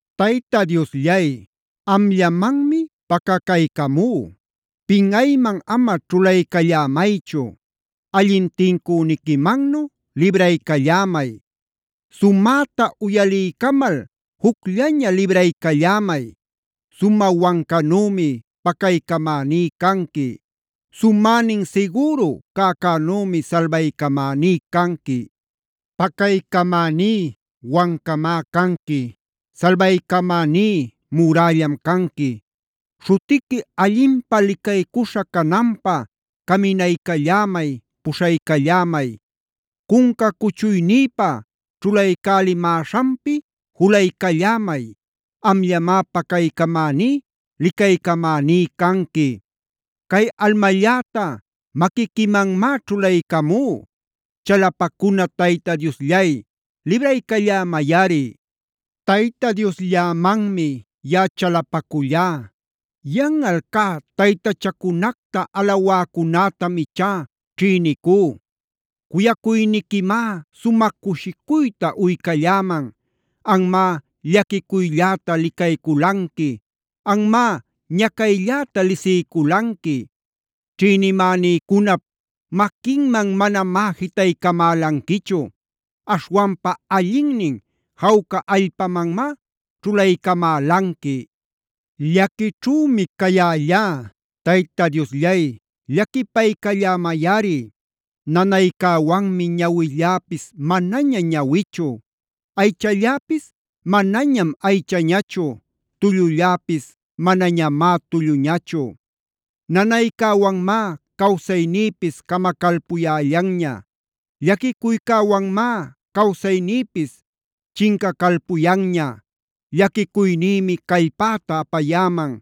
Tayta Diosllay, amllamanmi pacacaycamú. Pinꞌayman ama ćhulaycallämaychu. Allin tincüniquimannu libraycallämay. Sumäta uyaliycamal jucllaña libraycallämay. Sumä wancanümi pacaycamäní canqui. Sumänin sigüru cäcänümi salbaycamäní canqui. Pacaycamäní wancamá canqui. Salbaycamäní murällam canqui. Śhutiqui allinpä licaycuśha cananpä caminaycallämay, puśhaycallämay. Cunca cuchuynïpa ćhulaycälimäśhanpi julaycallämay; amllamá pacaycamäní, licaycamäní canqui. Cay almalläta maquiquimanmá ćhulaycamú.a Chalapacuna Tayta Diosllay, libraycallämayꞌari. Tayta Diosllämanmi yaꞌa chalapacullá. Yanꞌal cä taytachacunacta alawäcunätam ichá ćhïnicú. Cuyacuyniquimá sumä cushicuyta uycalläman. Anmá llaquicuylläta licayculanqui, anmá ñacaylläta lisiyculanqui. Ćhïnimänïcunap maquinman manamá jitaycamälanquichu. Aśhwanpa allinnin jawca allpamanmá ćhulaycamälanqui. Llaquićhümi cayällá. Tayta Diosllay llaquipaycallämayꞌari. Nanaycäwanmi ñawilläpis manaña ñawichu. Aychalläpis manañam aychañachu, tullulläpis manañamá tulluñachu. Nanaycäwanmá cawsaynïpis camacalpuyällanña. Llaquicuycäwanmá cawsaynïpis chincacalpuyanña. Llaquicuynïmi callpäta apayäman,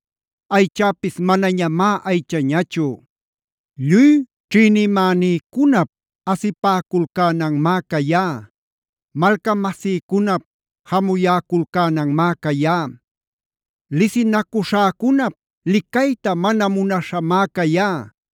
aychäpis mañamá aychañachu. Lluy ćhïnimänïcunap asipäculcänanmá cayá. Malcamasïcunap jamuyäculcänanmá cayá. Lisinacuśhäcunap licayta mana munaśhanmá cayá.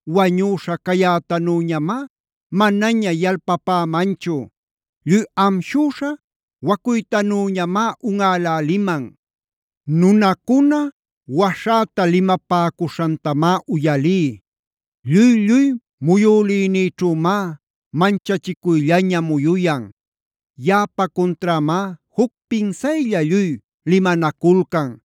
Wañüśha cayätanüñamá manaña yalpapämanchu. Lluy amshüśha wacuytanüñamá unꞌäläliman. Nunacuna waśhäta limapäcuśhantamá uyalí. Lluy-lluy muyülïnïćhümá manchachicuyllaña muyuyan. Yaꞌapa cunträmá juc pinsaylla lluy limanaculcan.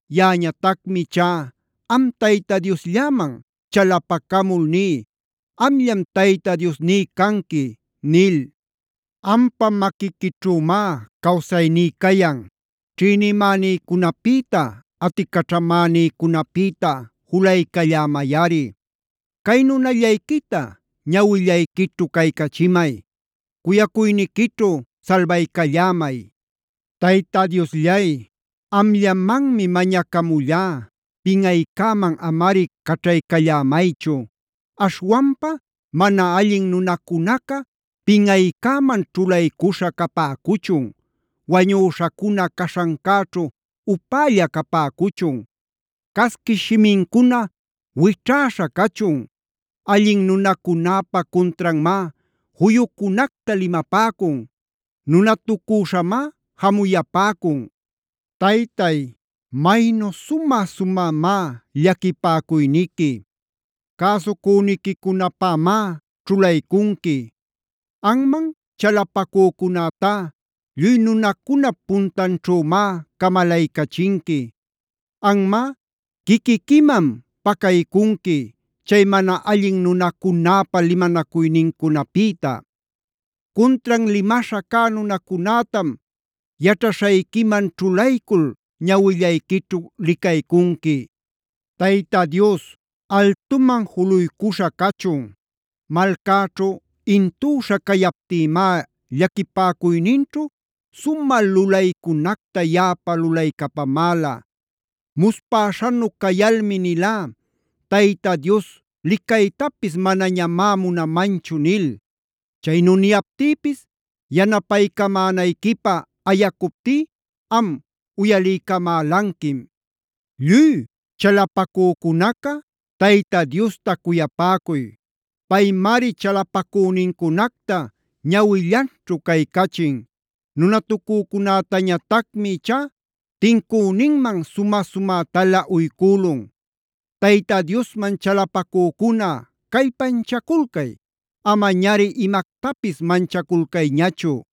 Yaꞌañatacmi ichá am Tayta Dioslläman chalapacamul ní: “Amllam Tayta Diosní canqui” nil. Ampa maquiquićhümá cawsayní cayan. Ćhïnimänïcunapïta, aticaćhamänicunapïta julaycallämayꞌari. Cay nunallayquita ñawillayquićhu caycachimay. Cuyacuyniquićhu salbaycallämay. Tayta Diosllay, amllamanmi mañacamullá. Pinꞌaycäman amari caćhaycallämaychu. Aśhwanpa mana allin nunacunaca pinꞌaycäman ćhulaycuśha capäcuchun. Wañüśhacuna caśhancäćhu upälla capäcuchun. Casquish shimincuna wićhäśha cachun. Allin nunacunäpa cuntranmá juyucunacta limapäcun. Nunatucüśhamá jamuyapäcun. Taytay, maynu sumä-sumämá llaquipäcuyniqui. Cäsucüniquicunapämá ćhulaycunqui. Anman chalapacücunätá lluy nunacunap puntanćhümá camalaycachinqui. Anmá quiquiquiman pacaycunqui chay mana allin nunacunäpa limanacuynincunapïta. Cuntran limaśha cä nunacunätam yaćhaśhayquiman ćhulaycul ñawillayquićhu licaycunqui. Tayta Dios altuman juluycuśha cachun. Malcäćhu intüśha cayaptïmá llaquipäcuyninćhu sumä lulaycunacta yaꞌapä lulaycapamäla. Muspäśhanu cayalmi nilá: “Tayta Dios licaytapis manañamá munamanchu” nil. Chaynu niyaptïpis yanapaycamänayquipä ayacuptí am uyaliycamälanquim. Lluy chalapacücunaca, Tayta Diosta cuyapäcuy. Paymari chalapacünincunacta ñawillanćhu caycachin. Nunatucücunätañatacmi ichá tincüninman sumä-sumätalä uycülun. Tayta Diosman chalapacücuna callpanchaculcay, amañari imactapis manchaculcayñachu.